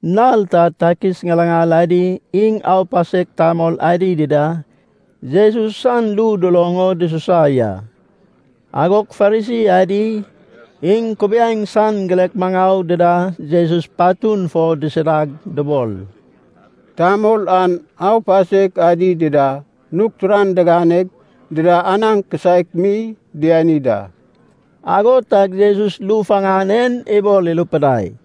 Nal ta takis ŋilaŋal adi iŋ aupasek tamol adi dida Jesus san ru duloŋ o dususa ya. Agog Farisi adi, iŋ kubiaeŋ san girek maŋau dida Jesus patun fo disidag dubol, “Tamol an aupasek adi dida nug turan diganeg dida anaŋ kisaek mi diani da.” Ago tag Jesus ru faŋan en ibol irupidai,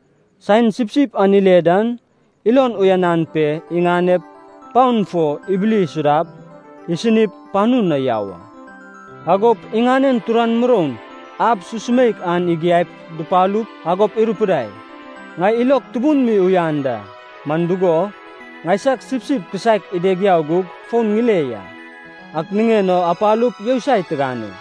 Saen sipsip an ile dan ilon uyanan pe, iŋanep paon fo ibili isudap, isinip, panu na yau a. Agop iŋanen turan muroun, ab susumeik an igiaip dupalup, agop irupidai, ‘Ŋai ilog tubun mi uyan da. Man dugo, ŋaisag sipsip kisaek ideg yau gug fon ŋile ya. Ak niŋen o apalup yousai tigane.’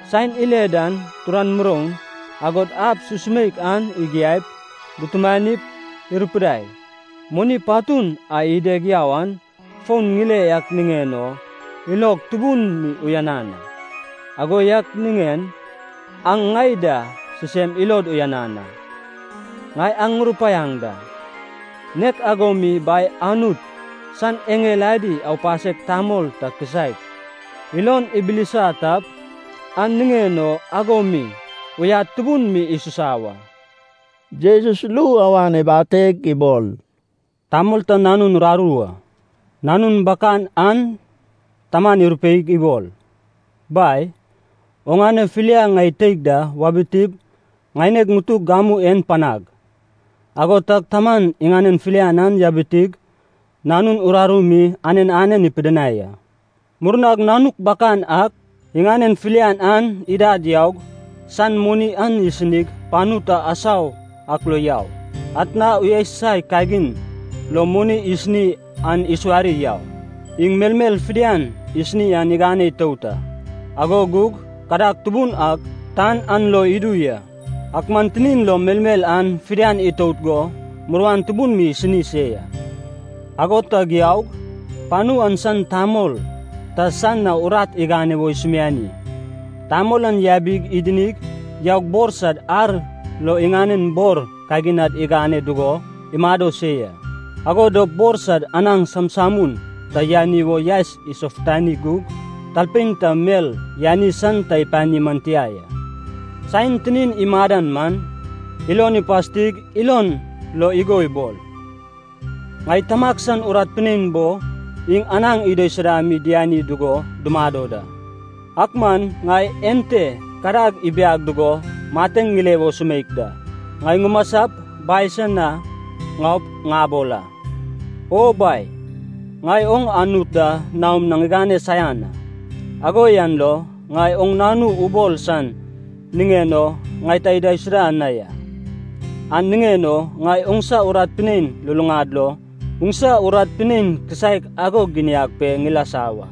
Saen ile dan turan muroun, agod ab susumeik an igiaip, dutumanip, irupidai, ‘Moni patun a ideg yau an fon ŋile ak niŋen o ilog tubun mi uyanan a. Ago yak niŋen aŋ ŋai da sisem ilod uyanan a.’ Ŋai aŋ ŋurupaiaŋ da, nek ago mi Bai Anut san eŋel adi aupasek tamol ta kisaek ilon ibilisa tap, an niŋen o ago mi uyad tubun mi isusa wa.” Jesus ru awan ibateg ibol, “Tamol ta nanun uraru a. Nanun bakan an taman irupeig ibol, ‘Bai, oŋane filia ŋai teig da wabitip ŋaineg ŋutug gamu en panag.’ Ago tag taman iŋanen filian an yabitig nanun uraru mi anen anen ipidinai a. “Murnag nanuk bakan ak iŋanen filian an idad yaug, san moni an isinig panu ta asau ak lo yau. Atna uyasusai kagin lo moni isini an isuwari yau. Iŋ melmel fidian isini an igane itout a, ago gug kadag tubun ak tan an lo idu ya. Ak man tinin lo melmel an fidian itout go muruan tubun mi isini se ya. Ago tag yaug, panu an san tamol ta san na urat igane wo isumiani. Tamol an yabig idinig yaug bor sad ar lo iŋanen bor kaginad igane dugo imado se ya. Ago dop bor sad anaŋ samsamun ta yani wo yaes isofutani gug talpein ta mel yani san ta ipani man tia ya. “Saen tinin imadan man, ilon ipastig ilon lo igo ibol, ‘Ŋai tamag san urat pinein bo iŋ anaŋ idaisuda mi diani dugo dumado da. Ak man ŋai ente kadag ibiag dugo mateŋ ŋile wo sumeik da! Ŋai ŋumasap bai san na ŋaup ŋabol a: O bai, ŋai oŋ Anut da naom na ŋigane saian a. Ago yan lo ŋai oŋ nanu ubol san niŋen o ŋai ta idaisuda na ya. An niŋen o ŋai oŋsa urat pinein luluŋad lo oŋsa urat pinein kisaek ago giniag pe ŋilasa wa.’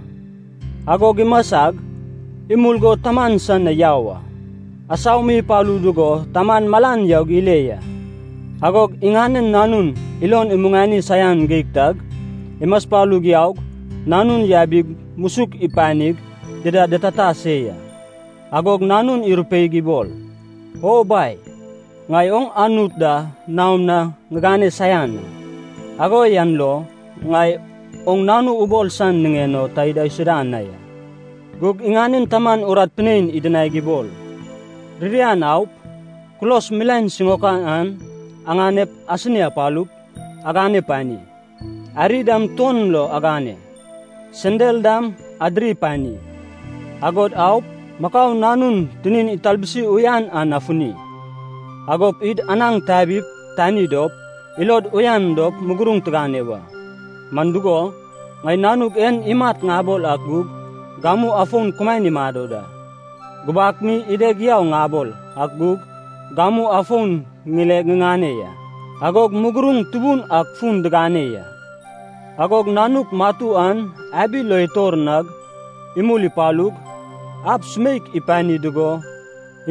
Agog imasag, imul go taman san na yau a. “Asau mi ipalu dugo taman malan yaug ile ya. Agog iŋanen nanun ilon imuŋani saian geig tag, imaspalug yaug, nanun yabig musuk ipanig ida ditata se ya. Agog nanun irupeig ibol, ‘O bai, ŋai oŋ Anut da naom na ŋigane saian a. Ago yan lo ŋai oŋ nanu ubol san niŋen o ta idaisuda na ya.’ “Gug iŋanen taman urat pinein idinaig ibol, ‘Ririan aup, kulos milaen siŋaokan an aŋanep asini apalup, agane pani. Ariy dam tuon lo agane. Sendal dam adiri pani. Agod aup, makau nanun tinin italbusi uyan an afuni. Agop id anaŋ tabip tani dop, ilod uyan dop muguruŋ tigane wa. Man dugo, ŋai nanug en imat ŋabol ak gug gamu afon kumaen imado da. Gubak mi ideg yau ŋabol ak gug gamu afon ŋileg ŋiŋane ya.’ Agog muguruŋ tubun ak fun digane ya. “Agog nanuk matu an abi lo itor nag imul ipalug, ab sumeik ipani dugo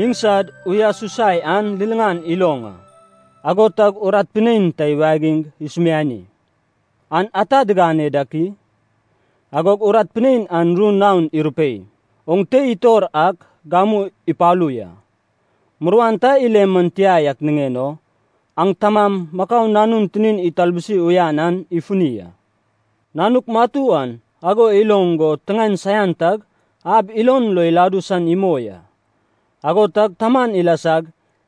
iŋ sad uyasusai an liliŋan iloŋ a. Ago tag urat pinein ta iwagig isumiani, ‘An ata digane dak i?’ Agog urat pinein an ru naon irupei, ‘Oŋ tei itor ak gamu ipalu ya. Muruan ta ile man tia yak niŋen o aŋ tamam makau nanun tinin italbusi uyan an ifuni a.’ “Nanuk matu an ago iloŋ go tiŋaen saian tag ab ilon lo iladu san imoi a. Ago tag taman ilasag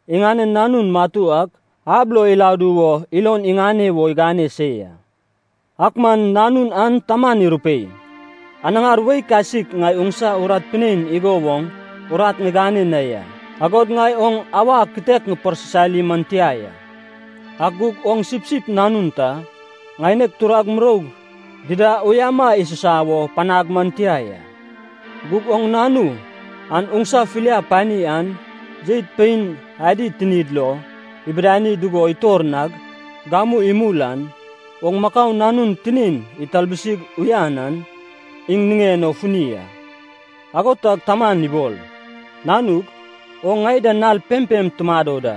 iŋanen nanun matu ak ab lo iladu wo ilon iŋane wo igane se ya. Ak man nanun an taman irupei, ‘Anaŋar wei kasik ŋai oŋsa urat pinein igo woŋ urat ŋigane na ya. Agod ŋai oŋ awa kitek ŋiparsisali man tia ya. Ak gug oŋ sipsip nanun ta, ŋaineg turag muroug dida uyama isusa wo panag man tia ya. Gug oŋ nanu an oŋsa filia pani an jeit pein adi tinid lo ibidani dugo itor nag, gamu imul an, oŋ makau nanun tinin italbusig uyan an iŋ niŋen o funi a.’ “Ago tag taman ibol, ‘Nanug, oŋ ŋai da nal pempem tumado da.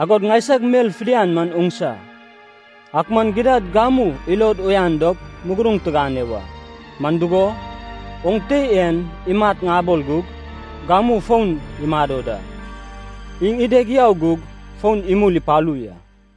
Agod ŋaisag mel fidian man oŋsa. Ak man gidad gamu ilod uyan dop muguruŋ tigane wa. Man dugo, oŋ tei en imat ŋabol gug, gamu fon imado da. Iŋ ideg yau gug fon imul ipalu ya.’”